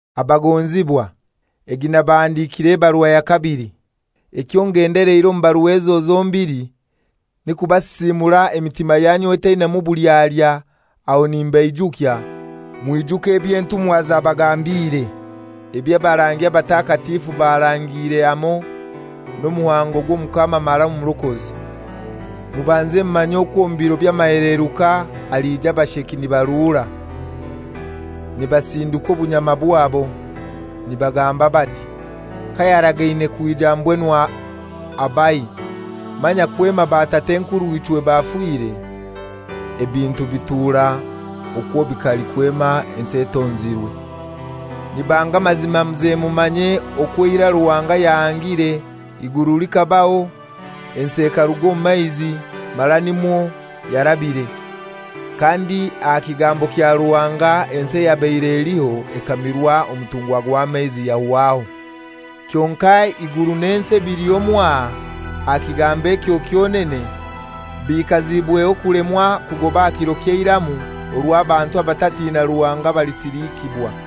Abagonzibwa, egi nabahandikira ebarua ya kabili. Ekyo ngendeleire omu barua ezo zombili ni kubasisiimura emitima yanyu etainamu bulyalya, aho nimbaijukya, mwijuke eby'entumwa zabagambiire, eby'abarangi abatakatifu barangire hamoi n'omuhango gw'Omukama mara Omurokozi. Mubanze mumanye okwo omu biro by'amaheleruka aliija abasheki nibaruura, nibasindikwa obunyama bwabo nibagamba bati, ¬ęKayaragaine kwija mbwenu abahai? Manya kwema batat'enkurw'ichwe bafiire, ebintu bitura okwo bikali kwema ensi etonzirwe.¬Ľ Nibanga amazima muze mumanye okwo eirai Ruhanga yahangire, eiguru likabaho. Ensi ekaruga omu maizi mara nimwo yarabire. Kandi aha kigambo kya Ruhanga ensi eyabaire eliho ekamirwa omutunga gw'amaizi, yahwaho. Kyonkai eiguru n'ensi ebiliho mwaha, aha kigambo ekyo kyonene, bikaziibweho kulemwa kugoba aha kiro ky'eiramu orwo abantu abatatina Ruhanga balisilikibwa.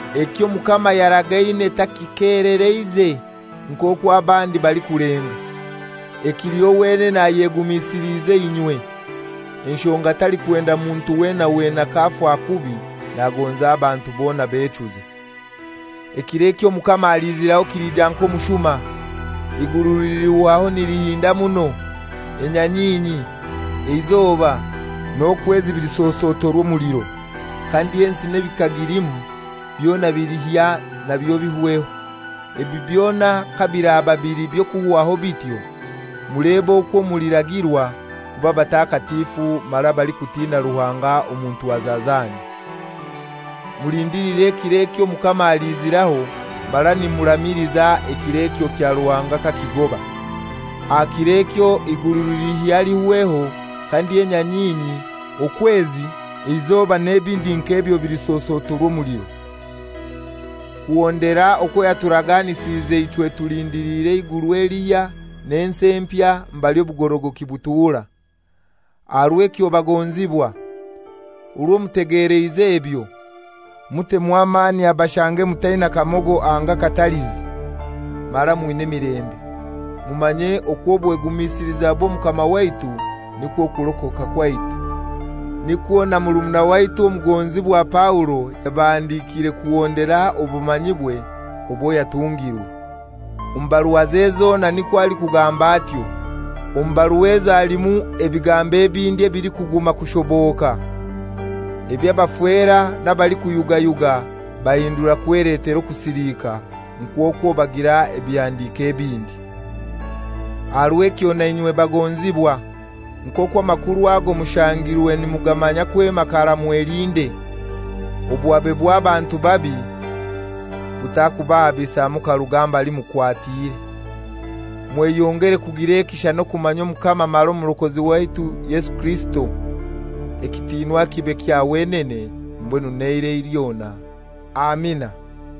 Ekyo Omukama yaragaine takikelereize, nk'okwo abandi balikulenga. Ekiliho wenene ayegumisiliize inywe, enshonga talikwenda muntu wena wena k'afa kubi. Nagonza abantu bona bechuze. Ekiro ekyo Omukama aliiziraho kiliija nk'omushuma. Eiguru lilihwaho nilihinda muno; enyanyinyi, eizoba, n'okwezi bilisosotorwa omuliro, kandi ensi n'ebikagilimu byona bilihya nabyo bihweho. Ebi byona kabiraba bili by'okuhwaho bityo, mulebe okwo mulikuragirwa kuba batakatifu mara abalikutina Ruhanga omu ntwaza zanyu, mulindiliire ekiro ekyo Omukama aliiziraho mara nimuramiliza ekiro ekyo kya Ruhanga kakigoba. Aha kir'ekyo eiguru lilihya lihweho, kandi enyanyinyi, okwezi, eizoba n'ebindi nk'ebyo bilisosotorwa omuliro. Kuhondera okwo yaturaganisize ichwe tulindiliire eiguru elihya n'ensi empya mbali obugorogoki butura. Aha rw'ekyo bagonzibwa, orwo mutegeleize ebyo, mutemu amani abashange mutaina kamogo anga katalizi, mara mwina emilembe. Mumanye okwo obwegumisiliza bw'Omukama waitu nikwo kurokoka kwaitu. Nikwo na murumuna waitu omugonzibwa Paulo, yabahandikiire kuhondera obumanyibwe obwo yatungirwe; omu baruaze zona nikwo alikugamba atyo. Omu barua ezo halimu ebigambo ebindi ebilikuguma kushoboka, eby'abafera n'abalikuyugayuga bahindura kweletera okusilika, nk'okwo bagira ebihandiko ebindi. Aha rw'ekyo nainywe bagonzibwa, nk'okwo amakuru ago mushangirwe nimugamanya kwema karai mwelinde, obuhabe bw'abantu babi butakubahabisa mukaruga mbali mukwatire. Mweyongere kugira ekisha n'okumanya Omukama mara Omurokozi waitu Yesu Kirisito. Ekitiinwa kibe kya wenene mbwenu n'eirai lyona. Amina.